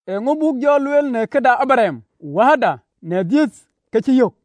Eeŋö buk jɔ lueel në këde Abraɣam wääda në dhiëth, kë cï yök?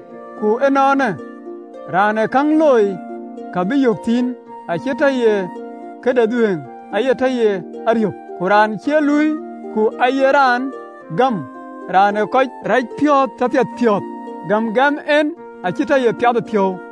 Ku ënɔɔnë, raan ë käŋ looi, ke de kë bï yök thïn, acie tɔ ye këde dhuëëŋ, aye tɔ ye ariöp. Ku raan cie luui, ku aye raan gäm, Raan ë kɔc racpiɔ̈ɔ̈th tɔ piɛthpiɔ̈ɔ̈th, gäm gɛ̈m en acï tɔ ye piathëpiɔ̈u.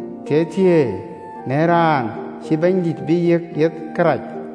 Thieithieei në raan cïï Bɛ̈nydït bï yiëk yeth kërac.”